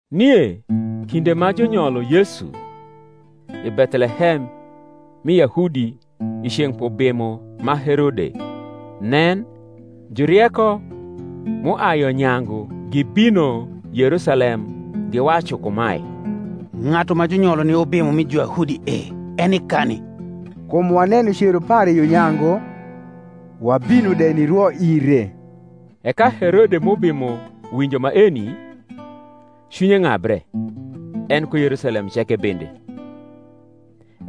Nie kinde ma junyolo Yesu i Bethlehem mi Yahudi i ceng’ p’ubimo ma Herode, nen, Jurieko m’uai yo nyangu gibino Yerusalem giwacu kumae, Ng’atu ma junyolo ni Ubimo mi Juyahudi e, eni kani? kum waneno cero pare yo nyangu, wabino de nirwo ire. E ka Herode m’ubimo winjo maeni, cwinye ng’abre, en ku Yerusalem ceke bende.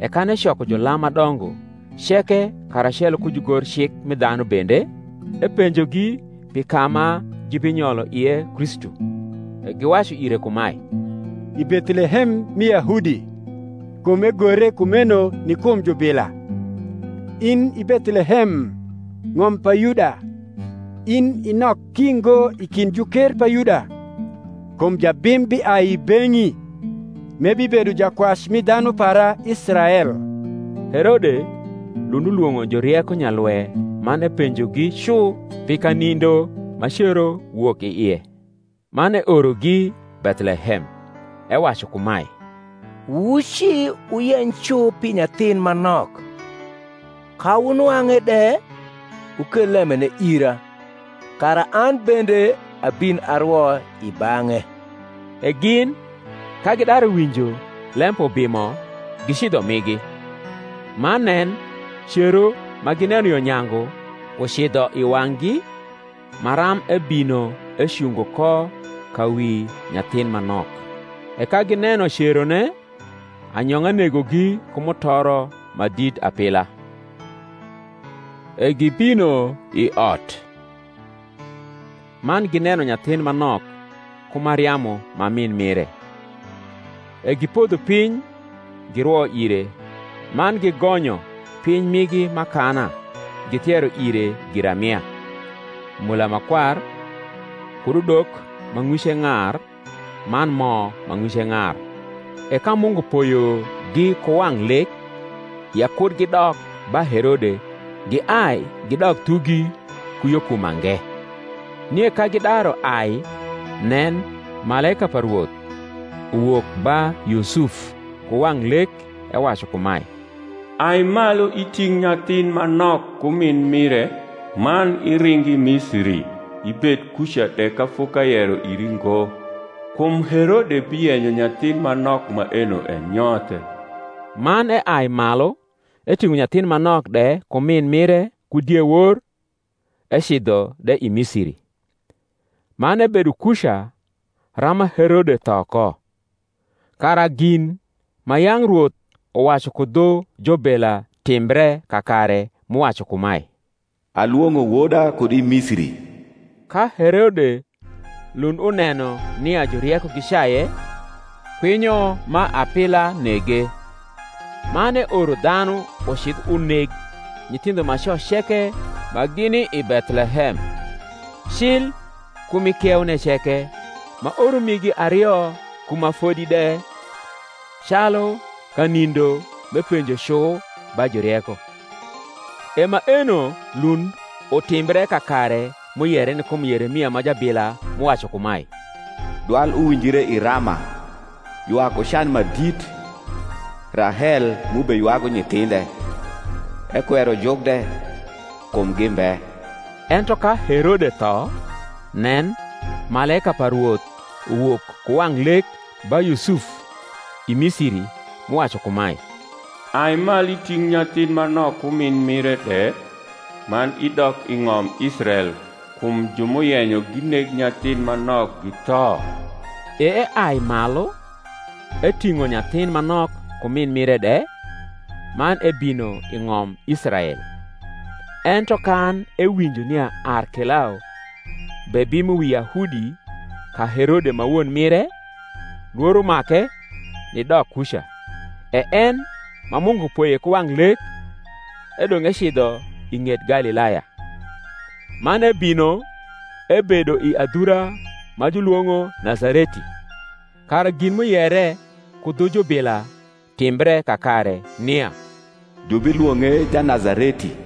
E kan ecoko julam ma dongo ceke karacelo ku jugorcik mi dhanu bende, epenjogi pi ka ma jubinyolo ie Kristu. E giwacu ire kumae, I Bethlehem mi Yahudi: kum egore kumeno ni kum jubila, In i Bethlehem, ng’om pa Yuda, In i nok ki ngo i kind juker pa Yuda: Kum jabim biai i beng’i, M’ebibedo jakwac mi dhanu para Israel. Herode lund ulwong’o Jurieko nyalwe man epenjogi cu pi kanindo ma cero wok i ie. Man eorogi Bethlehem, ewacu kumae, Wuci wuyeny cu pi nyathin ma nok; ka wunwang’e de, wukel lembene ira, kara an bende abin arwo i bang’e. E gin, ka gidaru winjo lem p’ubimo, gicidho migi; man nen, cero, ma gineno yo nyangu, ucidho i wang’gi, maram ebino ecungo ko ka wi nyathin ma nok. E ka gineno cerone, anyong’a negogi ku mutoro ma dit apila. E gibino i ot man gineno nyathin ma nok ku Mariamu ma min mire; e gipodho piny girwo ire; man gigonyo piny migi m’akana githiero ire giramia, mola ma kwar kud udok ma ng’wice ng’ar man mo ma ng’wice ng’ar. E ka Mungu poyogi ku wang’ lek ya ku gidok ba Herode, giai gidok thugi ku yo ku mange. Nie ka gidaru ai, nen, malaika pa Rwoth uwok ba Yusuf ku wang’ lek, ewacu kumae, Ai malu iting’ nyathin ma nok ku min mire, man iring i Misiri, ibed kuca de ka fok’ayero iri ngo: kum Herode biyenyo nyathin ma nok maeno enyothe. Man eai malu eting’o nyathin ma nok de ku min mire ku diewor, ecidho de i Misiri; man ebedo kuca rama Herode tho ko: kara gin ma yang’ Rwoth uwacu ku dhu jubila timbre kakare, m’uwacu kumae, Alwong’o woda kud i Misiri. Ka Herode lund uneno nia Jurieko gicaye, kwinyo ma apila nege, man eoro dhanu ucidh uneg nyithindho ma co ceke ma gini i Bethlehem, cil ku m’i kieune ceke, ma oro migi ario ku ma fodi de, calu kanindo m’epenjo cu ba Jurieko. E maeno lund utimbre kakare m’uyere ni kum Yeremia ma jabila m’uwacu kumae, Dwal uwinjre i Rama, Ywak ku can ma dit, Rahel m’ubeywagu nyithindhe; Ekwero juk de, kum gimbe. Ento ka Herode tho, nen, malaika pa Rwoth uwok ku wang’ lek ba Yusuf i Misiri, m’uwacu kumae, Ai malu iting’ nyathin ma nok ku min mire de, man idok i ng’om Israel: kum ju m’uyenyo gineg nyathin ma nok githo. E eai malu eting’o nyathin ma nok ku min mire de, man ebino i ng’om Israel. Ento kan ewinjo nia Arkelao bebimo wi Yahudi ka Herode ma won mire, lworo make nidok kuca; e en ma Mungu poye ku wang’ lek, edong’ ecidho i ng’et Galilaya, man ebino ebedo i adhura ma julwong’o Nazareti; kara gin m’uyere ku dhu jubila timbre kakare, nia jubilwong’e Janazareti.